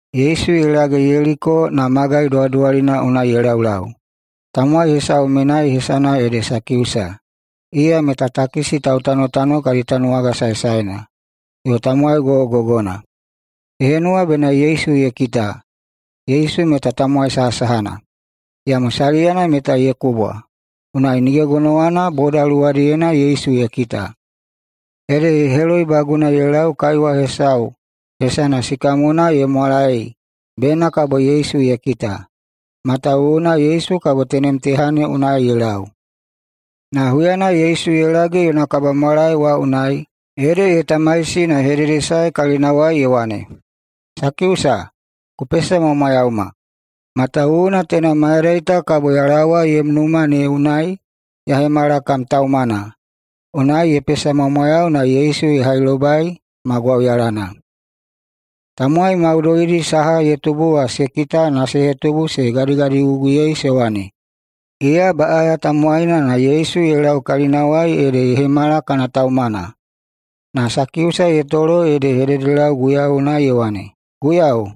Yesu ye lage Yeliko na magai duwaduwalina unai ye laulau. Tamowai hesau menai hesana ede Sakiusa. Iya meta takisi tautanotano kadi tanuwaga saesaena, yo tamowai gogogogona. Ye henuwa bena Yesu ye kita, Yesu meta tamowai sahasahana. Iyamo saliyana meta ye kubwa, unai nige gonowana boda luwadiyena Yesu ye kita. Ede ye heloibaguna ye lau kaiwa hesana sikamona ye mwalaei bena kabo Yesu ye kita, matawuwuna Yesu kabo tenem teha ne unai ye lau. Na huyana Yesu ye lage yona kabamwalae wa unai ede ye tamaisi na ye hededesae kalinawai ye wane, “Sakiusa, ku pesamwamwayauma. Matawuwuna teina mayadai ta kabo ya laowa yom numa ne unai ya hemala kam taumana.” Unai ye pesamwamwayau na Yesu ye hailobai ma gwauyalana. Tamowai maudoidi saha ye tubu wa se kita na se hetubu se gadigadiguguyei se wane, “Iya baꞌaya tamowaina, na Yesu ye lau kalinawai ede ye hemala kana taumana.” Na Sakiusa ye tolo ede ye hededelau Guiyau unai ye wane, “Guiyau!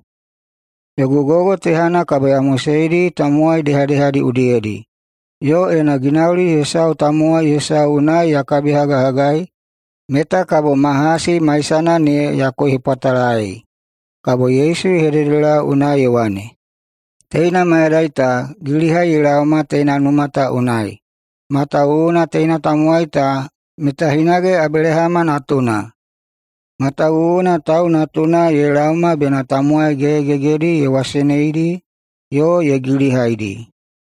Yogu gogo tehana kabo ya moseidi tamowai dehadehadi udiyedi, yo ena ginauli hesau tamowai hesau unai ya kabihagahagai meta kabo ma hasi maisana ne ya koihepwatalaei.” Kabo Yesu ye hededelau unai ye wane, “Teina mayadai ta, gilihai ye laoma teina numa ta unai, matawuwuna teina tamowai ta meta hinage Abelahama natuna. Matawuwuna Tau Natuna ye laoma bena tamowai gegegegedi ye waseneidi yo ye gilihaidi.”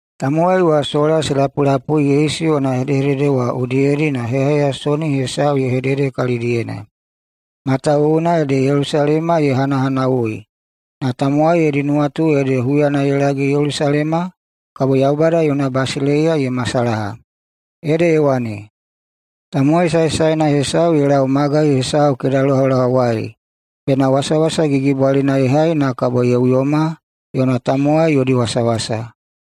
Tamowai wa sola se lapulapui Yesu yona hedehedede wa udiyedi na heyaheyasoni hesau ye hedede kalidiyena, matawuwuna ede Yelusalema ye hanahanawui na tamowai yodi nuwatu ede huyana ye lage Yelusalema, kabo Yaubada yona basileiya ye masalaha. Ede ye wane, “Tamowai saesaena hesau ye lau magai hesau kedalohalohawai bena wasawasa gigibwalina ye hai na kabo ye uyoma yona tamowai yodi wasawasa.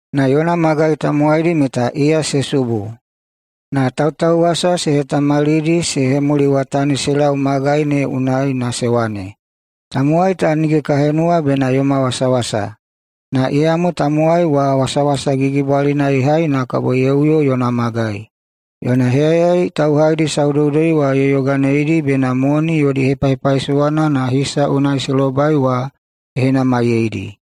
Na yona magai tamowaidi meta iya se subu na tautauwasa se hetamalidi se hemuliwatani se lau magai ne unai na se wane, ‘Tamowai ta nige ka henuwa bena yoma wasawasa!’ Na iyamo tamowai wa wasawasa gigibwalina ye hai na kabo ye uyo yona magai. Yona heyayai tauhaidi saudoudoi wa ye yoganeidi bena moni yodi hepahepaisowana na hisa unai se lobai wa ye henamaiyeidi.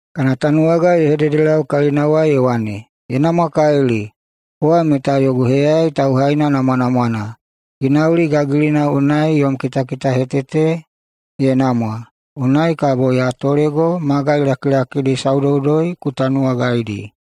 Kana tanuwaga ye hededelau kalinawai ye wane, ‘Ye namwakalili! Kowa meta yogu heyayai tauhaina namwanamwana! Ginauli gagilina unai yom kitakitahetete ye namwa, unai kabo ya tolego magai lakilakidi saudoudoi ku tanuwagaidi.’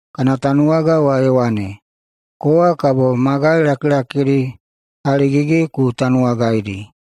Kana tanuwaga wa ye wane, ‘Kowa kabo magai lakilakidi haligigi ku tanuwagaidi.’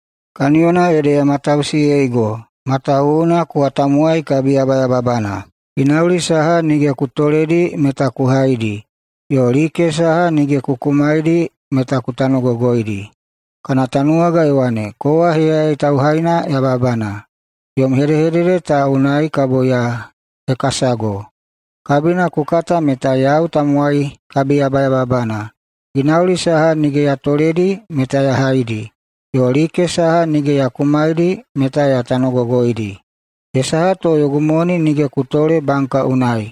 kaniyona ede ya matausiyeigo, matawuwuna kowa tamowai kabiyabayababana. Ginauli saha nige ku toledi meta ku haidi, yo like saha nige ku kumaidi meta ku tanogogoidi.’ Kana tanuwaga ye wane, ‘Kowa heyayai tauhaina yababana! Yom hedehedede ta unai kabo ya hekasago! Kabina ku kata meta yau tamowai kabiyabayababana, ginauli saha nige ya toledi meta ya haidi, yo like saha nige ya kumaidi ne meta ya tanogogoidi. Ye saha to yogu moni nige ku tole banka unai?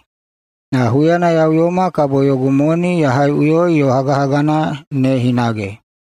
Na huyana ya uyoma kabo yogu moni ya haiꞌuyoi yo hagahagana ne hinage.’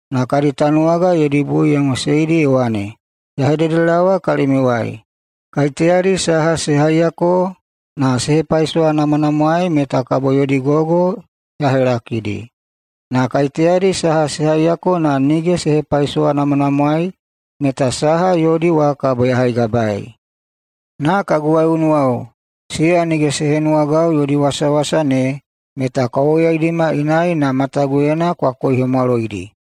Na kadi tanuwaga yodi bui ye moseidi ye wane, ‘Ya hededelaowa kalimiuwai: Kaiteyadi saha se haiyako na se hepaisowanamwanamwaei meta kabo yodi gogo ya helakidi. Na kaiteyadi saha se haiyako na nige se hepaisowanamwanamwaei meta saha yodi wa kabo ya haigabaei. Na kagu waiꞌunuwao, siya nige se henuwagau yodi wasawasa ne, meta kwa woyaidima inai na mataguyena kwa koihemwaloidi.’”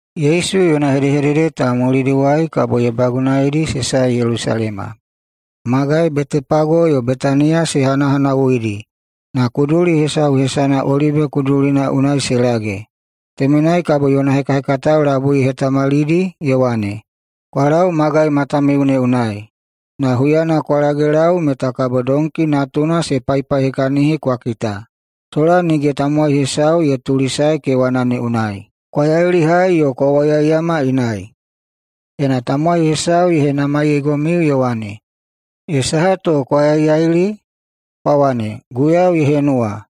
Yesu yona hedehedede ta mulidiwai kabo ye bagunaidi se sae Yelusalema. Magai Betepage yo Betaniya se hanahanawuidi na kuduli hesau hesana Olibe Kudulina unai se lage. Temenai kabo yona hekahekatao labui ye hetamalidi ye wane, “Kwa lau magai matamiu ne unai, na huyana kwa lagelau meta kabo donki natuna se paipaihekahini kwa kita, sola nige tamowai hesau ye tulisae kewana ne unai. Kwa yailihai yo kwa woyaiyama inai. Ena tamowai hesau ye henamaiyeigomiu ye wane, ‘Ye saha to kwa yaiyaili?’, kwa wane, ‘Guiyau ye henuwa.’”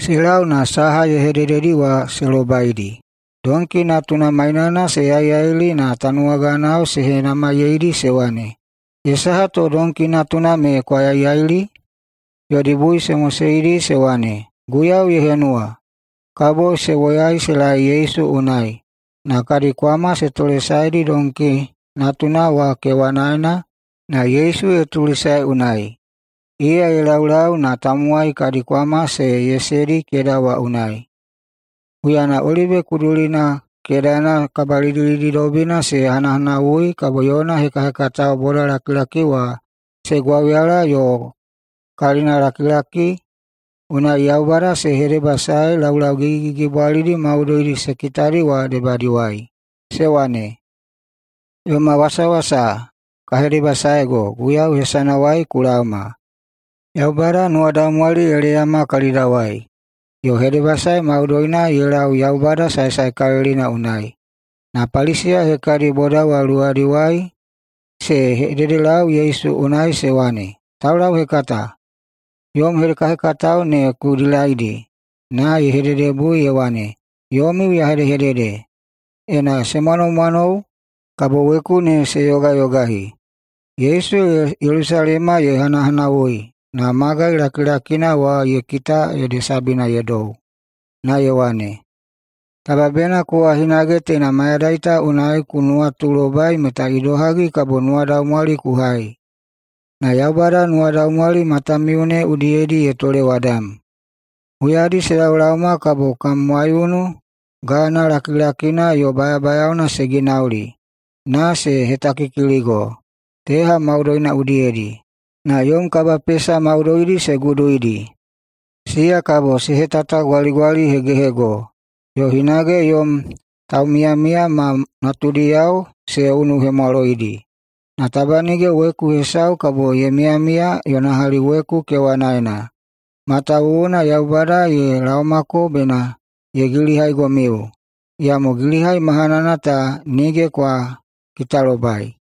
Se lau na saha ye hedededi wa se lobaidi. Donki natuna mainana se yaiyaili, na tanuwaganao se henamaiyeidi se wane, “Ye saha to donki natuna me kwa yaiyaili?” Yodi bui se moseidi se wane, “Guiyau ye henuwa.” Kabo se woyai se laei Yesu unai, na kadi kwama se tolesaedi donki natuna wa kewanaena na Yesu ye tulisae unai. Iya ye laulau na tamowai kadi kwama se yesedi keda wa unai. Huyana Olibe Kudulina kedana kabalidilididobina ye hanahanawui kabo yona hekahekatao bodalakilaki wa se gwauyala yo kalinalakilaki unai Yaubada se hedebasaei laulau gigigigibwalidi maudoidi se kitadi wa debadiwai, se wane, “Yoma wasawasa, ka hedebasaego, Guiyau hesanawai ku laoma!” “Yaubada nuwadaumwali ye leyama kalidawai yo hedebasae maudoina ye lau Yaubada Saesaekalilina unai!” Na Paliseya hekadi boda wa luwadiwai se hededelau Yesu unai se wane, “Taulauhekata, yom hekahekatao ne ku dilaidi!” Na ye hededebui ye wane, “Yomiu ya hedehedede: Ena se mwanomwanou, kabo weku ne se yogayogahi!” Yesu Yelusalema ye hanahanawui na magai lakilakina wa ye kita ede sabina ye dou, na ye wane, “Taba bena kowa hinage teina mayadai ta unai ku nuwatulobai meta idohagi kabo nuwadaumwali ku hai. Na Yaubada nuwadaumwali matamiu ne udiyedi ye tolewadam. Huyadi se laolaoma kabo kam waiunu gana lakilakina yo bayabayaona se ginauli na ye hetakikiligo teha maudoina udiyedi, na yom kabapesa maudoidi se guduidi. Siya kabo se hetatagwaligwalihegehego yo hinage yom taumiyamiya ma natudiyao se unuhemwaloidi. Na taba nige weku hesau kabo ye miyamiya yona hali weku kewanaena, matawuwuna Yaubada ye laomako bena ye gilihaigomiu, iyamo gilihai mahanana ta nige kwa kitalobai.”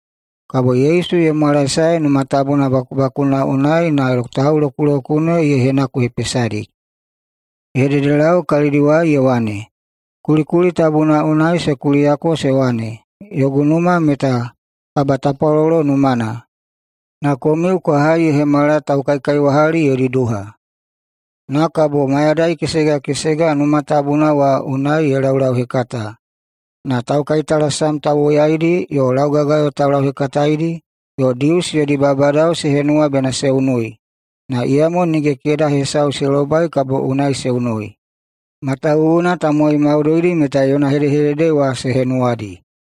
Kabo Yesu ye mwalaesae Numa Tabuna bakubakuna unai na taulokulokune ye henakuhepesadi. Ye hededelau kalidiwai ye wane, “Kulikuli tabuna unai se kuliyako se wane, ‘Yogu numa meta kabatapwalolo numana’, na komiu kwa hai ye hemala ‘taukaikaiwahali yodi duha’.” Na kabo mayadai kesega kesega Numa Tabuna wa unai ye laulauhekata. Na taukaitalasam tauwoyaidi yo laugagayo taulauhekataedi yo Dius yodi babadao se henuwa bena se unui. Na iyamo nige keda hesau se lobai kabo unai se unui, matawuwuna tamowai maudoidi meta yona hedehedede wa se henuwadi.